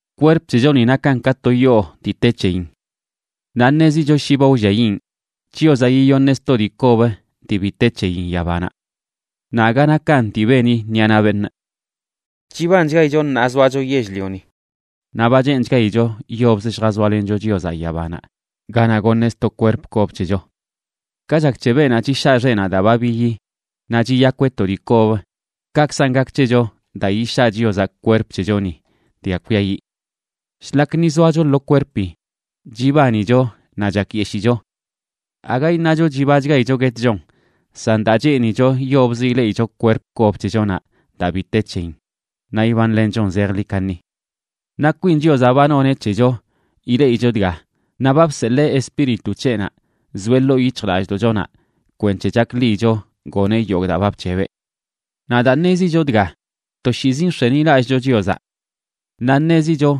Kwerp c̱hechoni nakan ka to yoo dii te c̱heyin. Naꞌ ṉezicho shi ba wlliayiꞌn, Chiozaꞌ yiyoṉeꞌ sto dii kob dii bi te c̱heyin yabanaꞌ. Naꞌ aga nakan dii beni ṉiꞌa naꞌ beṉꞌ. Chibanchgaicho ṉaa zoacho yell-lioni, naꞌ ba cheenchgaicho yobzə lljazoalencho Chiozaꞌ yabanaꞌ ganaꞌ goṉeꞌ sto kwerp kob c̱hecho. Ka chak c̱he beenaꞌ chishaa xeꞌnaꞌ daa ba biyi naꞌ chiyakweꞌ to dii kob, kakzan gak c̱hecho daa yishaa Chiozaꞌ kwerp c̱hechoni dga kwiayiꞌ. Shlak ni zoacho lo kwerpi, chibanicho naꞌ chakyeshicho. Aga iṉacho chibachgaicho guetchon, san daa cheenicho yobzə ileꞌicho kwerp kob c̱hechonaꞌ daa bi te c̱heyin naꞌ ibanlenchon zejḻi kaṉi. Naꞌ kwin Chiozaꞌ ba noneꞌ c̱hecho ileꞌicho dga, naꞌ ba bseḻee Espíritu c̱heꞌnaꞌ zoeꞌ ḻoo yic̱hjlallꞌdoꞌchonaꞌ kwenc̱he chakḻiyicho goneꞌ yogꞌ daa ba bc̱hebeꞌ. Naꞌ daa ṉezicho dga, toshiizi nx̱enilallꞌcho Chiozaꞌ. Naꞌ ṉezicho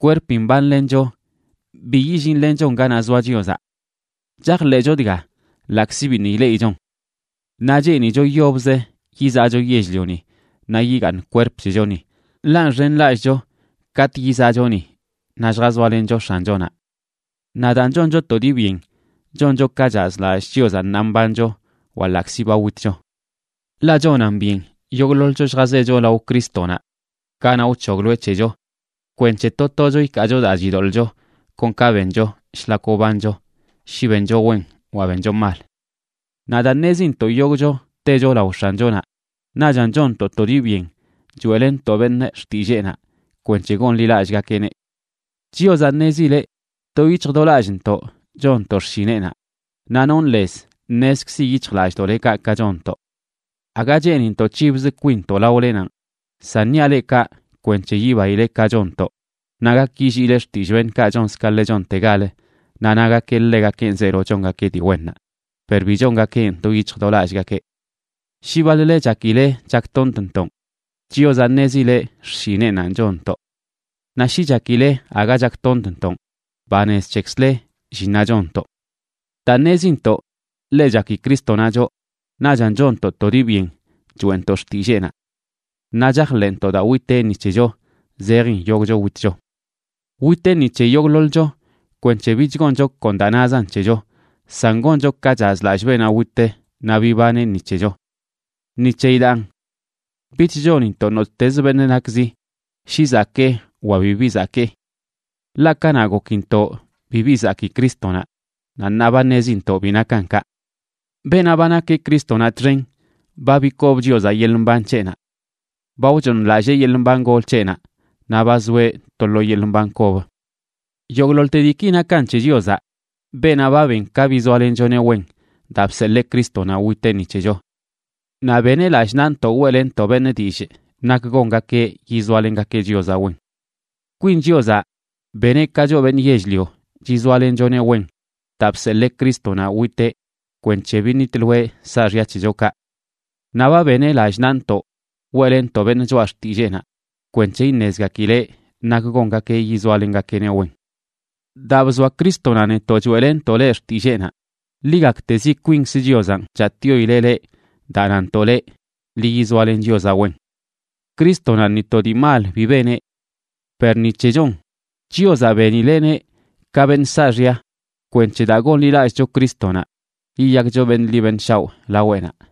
kwerpi mbanlencho, bi yillinlenchon ganaꞌ zoa Chiozaꞌ. Chajḻeꞌcho dga, ḻaꞌkzi biṉꞌ ileꞌichon. Naꞌ cheenicho yobzə yizaꞌcho yell-lioni naꞌ yigaaṉ kwerp c̱hechoni, ḻaꞌ nxenlallꞌcho katꞌ yizaꞌcho ni, naꞌ lljazoalencho X̱anchonaꞌ. Naꞌ daan, choncho to dii byen choncho ka chazlallꞌ Chiozaꞌ ṉaa mbancho wa ḻaꞌkzi ba witcho. Ḻaꞌ chonan byen yogꞌḻoḻcho lljazecho lao Crístonaꞌ ganaꞌ wc̱hogloeꞌ c̱hecho, kwenc̱he to tocho ikaacho daa chidoḻꞌcho kon ka bencho shlak wbancho, shi bencho wen wa bencho mal. Naꞌ daa ṉezintoꞌ yogꞌcho techo lao X̱anchonaꞌ, naꞌchan chonntoꞌ to dii byen choeꞌlenntoꞌ beṉꞌ xtilleenaꞌ kwenc̱he gonḻilallꞌgakeꞌneꞌ. Chiozaꞌ ṉezileꞌ do yic̱hj do lallꞌntoꞌ chonntoꞌ xshineꞌnaꞌ, naꞌ nonꞌ lez ṉezkzi yic̱hjlallꞌdoꞌlekaꞌ ka chonntoꞌ. Aga cheenintoꞌ c̱hibzə kwinntoꞌ laolenanꞌ, san niaꞌ leꞌ kaꞌ kwenc̱he yibaile ka chonntoꞌ naꞌ gak yilliile xtillꞌ beṉꞌkaꞌ chonz ka ḻe chontegalə naꞌ nagakeꞌ ḻegakenꞌ zeelo chongakeꞌ dii wennaꞌ per bi chongakeꞌn do yic̱hj do lallꞌgakeꞌ. Shi baḻ-le chakile chaktontntoꞌn, Chiozaꞌ ṉezileꞌ xshineꞌnanꞌ chonntoꞌ. Naꞌ shi chakile aga chaktontntoꞌn, banez c̱hekzle llinnaꞌ chonntoꞌ. Daa ṉezintoꞌ ḻe chaki Crístonaꞌ choꞌ, naꞌchan chonntoꞌ to dii byen choeꞌntoꞌ xtilleenaꞌ. Naꞌ chajḻeꞌntoꞌ daa witeꞌ ni c̱hecho, zejin yogꞌcho witcho. Witeꞌ ni c̱he yogꞌḻoḻcho kwenc̱he bich goncho kon daa nazan c̱hecho, san goncho ka chazlallꞌ beenaꞌ wit naꞌ bibaneꞌ ni c̱hecho. Ni c̱heyi daan, bich chonintoꞌ nottez beṉꞌ nakzi, shi zakee wa bibi zakee. Ḻaꞌ kanaꞌ gokintoꞌ bibi zakii Crístonaꞌ, naꞌ ṉaa ba ṉezintoꞌ bi nakan kaꞌ. Beenaꞌ ba nakeꞌ Crístonaꞌ txen, ba bikob Chiozaꞌ yeḻꞌ mban c̱heꞌnaꞌ. Ba wchooṉlallee yeḻꞌ mban gol c̱heꞌnaꞌ, naꞌ ba zoeꞌ to lo yeḻꞌ mban kob. Yogꞌḻoḻte diiki nakan c̱he Chiozaꞌ, beenaꞌ ba ben ka bizoalenchoneꞌ wen daa bseḻee Crístonaꞌ witeꞌ ni c̱hecho. Naꞌ beneꞌ lallꞌ nantoꞌ weꞌlenntoꞌ beṉꞌ dillꞌ nak gongakeꞌ yizoalengakeꞌ Chiozaꞌ wen. Kwin Chiozaꞌ beneꞌ ka choꞌ beṉꞌ yell-lio chizoalenchoneꞌ wen daa bseḻee Crístonaꞌ witeꞌ kwenc̱he biṉitloeꞌ saaxya c̱hechokaꞌ. Naꞌ ba beneꞌ lallꞌ naꞌntoꞌ weꞌlenntoꞌ beṉꞌ choꞌa xtilleenaꞌ kwenc̱he iṉezgakileꞌ nak gongakeꞌ yizoalengakeꞌneꞌ wen. Daa bzoa Crístonaꞌ netoꞌ choeꞌlenntoꞌ leꞌ xtilleenaꞌ, ḻi gaktezi kwinkz Chiozanꞌ chatꞌyoileꞌ leꞌ daa nantoꞌ leꞌ: “Ḻi yizoalen Chiozaꞌ wen.” Crístonaꞌ ni to dii mal bi beneꞌ. Per ni c̱hecho chonꞌ, Chiozaꞌ benileꞌneꞌ ka beṉꞌ saaxya, kwenc̱he daa gonḻilallꞌcho Crístonaꞌ yiyakcho beṉꞌ ḻi beṉꞌ shaoꞌ laweꞌnaꞌ.